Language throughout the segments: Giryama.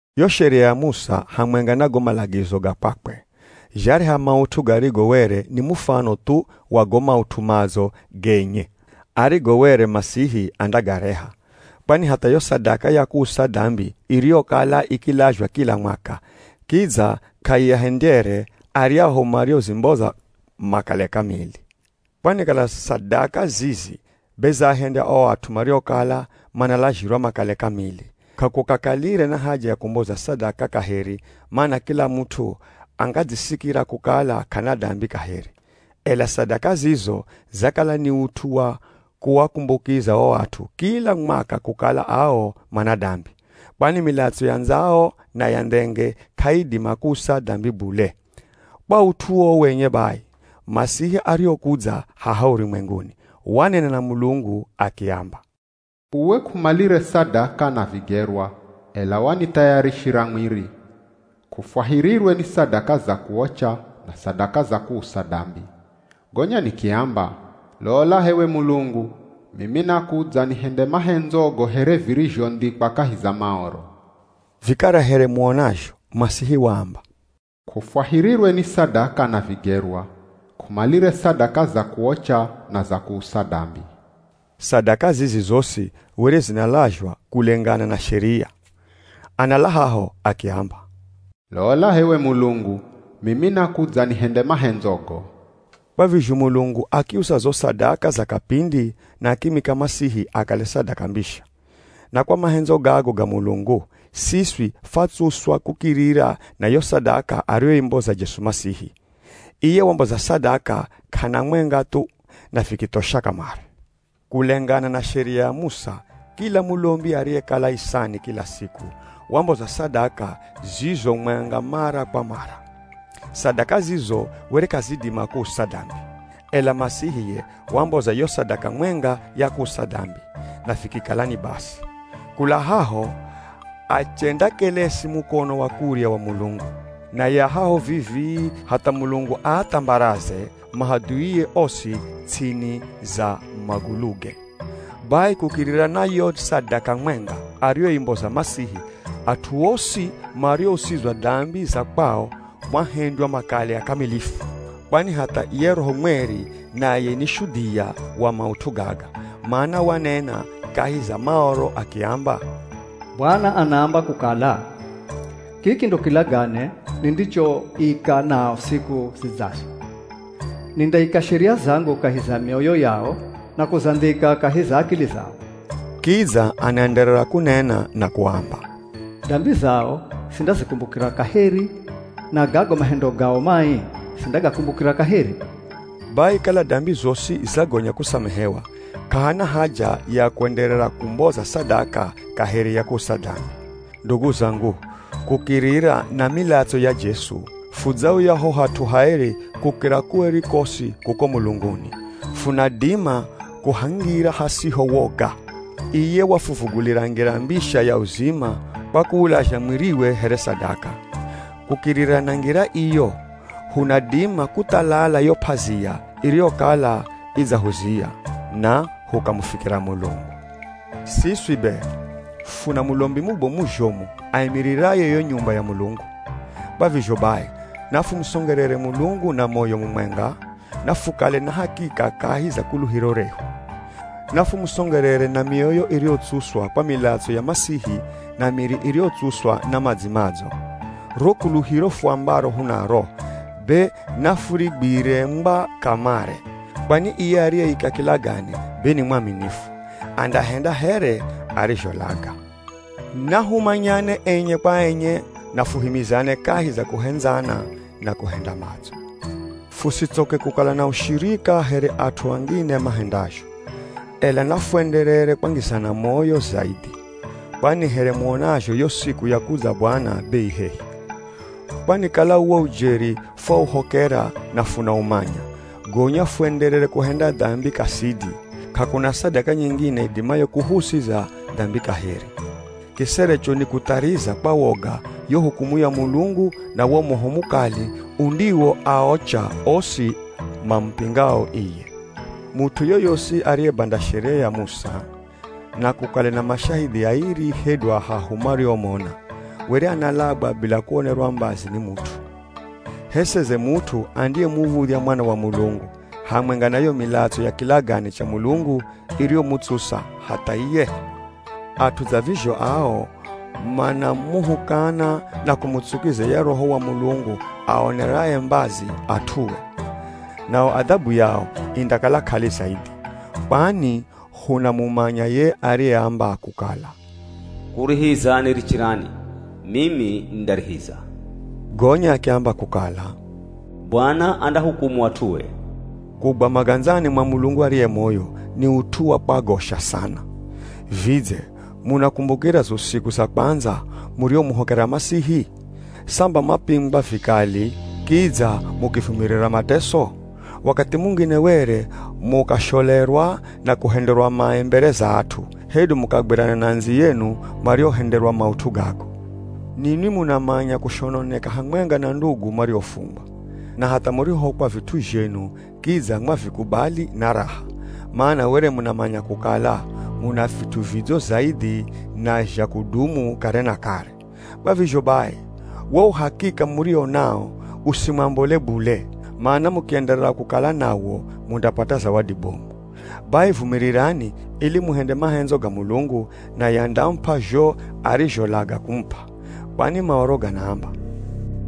Yo Sheria ya Musa hamwenga na go malagizo ga kwakwe, zhareha maut'u garigo were ni mufano thu wa go maut'u madzo genye arigo were Masihi andagareha. Kwani hatha yo sadaka ya kuusa dambi iriyokala ikilazhwa kila mwaka, kidza k'aiahendyere aryahu mariozimboza makale kamili. Kwani kala sadaka zizi be zaahendya o at'u mariokala manalazhirwa makale kamili, k'akukakalire na haja ya kumboza sadaka kaheri, mana kila mut'u angadzisikira kukala k'ana dambi kaheri. Ela sadaka zizo zakala ni ut'u wa kuakumbukiza o at'u kila mwaka kukala ao mana dambi. Kwani milatso ya ndzao na ya ndhenge k'aidima kuusa dambi bule. Kwa ut'u uwo wenye bai, Masihi arihokudza haha urumwenguni, wanena na Mulungu akiamba, “Uwe k'umalire sadaka na vigerwa, ela wanithayarishira mwiri. K'ufwahirirwe ni sadaka za kuocha, na sadaka za kuusa dambi. Gonya nikiamba, ‘Lola h'ewe Mulungu, mimi nakudza nihende mahendzogo here virizhondhikwa kahi za Maoro.’” Vikara here muonazho, Masihi waamba, “K'ufwahirirwe ni sadaka na vigerwa. K'umalire sadaka za kuocha na za kuusa dambi.” (Sadaka zizi zosi were zinalazhwa kulengana na sheria.) Anala haho, akiamba, “Lola h'ewe Mulungu, mimi nakudza nihende mahendzogo.” Kwa vizho Mulungu akiusa zo sadaka za kapindi na akimwika Masihi akale sadaka mbisha. Na kwa mahendzo gago ga Mulungu, siswi fwatsuswa kukirira na yo sadaka ariyoimboza Jesu Masihi. Iye wamboza sadaka k'ana mwenga thu, na vikithosha kamare. Kulengana na Sheria ya Musa, kila mulombi ariyekala isani kila siku, wamboza sadaka zizo mwenga mara kwa mara. Sadaka zizo were k'azidima kuusa dambi. Ela Masihi ye wamboza yo sadaka mwenga ya kuusa dambi, na vikikala ni basi. Kula haho achendakelesi mukono wa kurya wa Mulungu. Naye a haho vivii, hatha Mulungu aathambaraze mahadhuie osi ts'ini za maguluge. Bai kukirira na yo sadaka mwenga ariyoimboza Masihi at'u osi mariousizwa dambi za kwao waahendya makale akamilifu. Kwani hatha ye Roho Mweri naye ni shudhia wa maut'u gaga, mana wanena kahi za Maoro akiamba, “Bwana anaamba kukala, ‘Kiki ndo kilagane nindichoika nao siku zidzazo: Nindaika sheria zangu kahi za mioyo yao, na kuzandhika kahi za akili zao.’” Kidza anaenderera kunena na kuamba, “Dambi zao sindazikumbukira kaheri, na gago mahendo gao mai sindagakumbukira kaheri.” Bai kala dambi zosi zagonya kusamehewa, k'ahana haja ya kwenderera kumboza sadaka kaheri ya kuusa dambi. Ndugu zangu, kukirira na milatso ya Jesu, fudzauya ho Hat'u Haeri Kukira Kueri Kosi kuko mulunguni, funadima kuhangira hasiho woga. Iye wahuvugulira ngira mbisha ya uzima kwa kuulazha mwiriwe here sadaka. Kukirira na ngira iyo, hunadima kuthalala yo p'azia iriyokala idzahuzia, na hukamufikira Mulungu. Siswi be funa mulombi mubomu zhomu aimiriraye yo nyumba ya Mulungu. Kwa vizho bai, nafumusongerere Mulungu na moyo mumwenga, na fukale na hakika kahi za kuluhiro rehu. Nafumusongerere na mioyo iriyotsuswa kwa milatso ya Masihi na miri iriyotsuswa na madzi madzo. Ro kuluhiro fuambaro hunaro, be nafurigwire ngwa kamare, kwani iye ariyeika kilagane be ni mwaminifu, andahenda here arizholaga. Nahumanyane enye kwa enye na fuhimizane kahi za kuhendzana na kuhenda madzo. Fusitsoke kukala na ushirika here at'u angine mahendazho, ela nafuenderere kwangizana moyo zaidhi, kwani here muonazho yo siku ya kudza Bwana be i hehi. Kwani kala uwo ujeri fwauhokera na funaumanya, gonya fuenderere kuhenda dambi kasidi, k'akuna sadaka nyingine idimayo kuhuusiza dambi kaheri. Kiserecho ni kuthariza kwa woga yo hukumu ya Mulungu na wo moho mukali undiwoaocha osi mamupingao iye. Mut'u yoyosi ariyebanda Sheria ya Musa, na kukale na mashahidhi airi hedu ahahu mariomona, were analagwa bila kuonerwa mbazi ni mut'u. H'e seze mut'u andiyemuv̱udhya Mwana wa Mulungu, hamwenga na yo milatso ya kilagane cha Mulungu iriyomutsusa hatha iye? At'u dza vizho ao manamuhukana na kumutsukiza ye Roho wa Mulungu aaoneraye mbazi at'ue. Nao adhabu yao indakala k'ali zaidhi. Kwani hunamumanya ye ariyeamba kukala, “Kurihiza nirichirani, mimi nindarihiza.” gonya akiamba kukala, “Bwana andahukumu at'ue.” Kugwa magandzani mwa Mulungu ariye moyo, ni ut'u wa kwagosha sana. Vidze munakumbukira zo siku za kwandza murihomuhokera Masihi? Samba mwapingwa vikali kidza mukivumirira mateso? Wakathi mungine were mukasholerwa na kuhenderwa mai mbere za at'u, hedu mukagwirana na andziyenu mariohenderwa maut'u gago. Ninwi munamanya kushononeka hamwenga na ndugu mariofungwa. Na hatha murihohokwa vit'u zhenu kidza mwavikubali na raha, mana were munamanya kukala muna vit'u vidzo zaidhi na zha kudumu kare na kare. Kwa vizho bai, wo uhakika muriwo nawo usimwambole bule, mana mukienderera kukala nawo mundapata zawadi bomu. Bai vumirirani, ili muhende mahendzo ga Mulungu, naye andamup'a zho arizholaga kumup'a. Kwani Maoro ganaamba,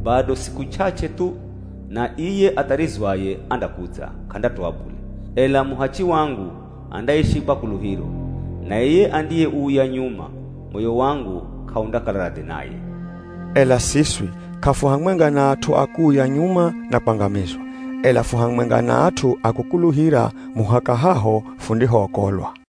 “Bado siku ch'ach'e thu, na iye atharizwaye andakudza, k'andatoa bule. Ela muhachi wangu, andaishi kwa kuluhiro. Na iye andiyeuya nyuma, moyo wangu k'aundakala radhi naye.” Ela siswi, k'afuhamwenga na at'u a kuuya nyuma na kwangamizwa, ela fu hamwenga na at'u a kukuluhira muhaka haho fundihookolwa.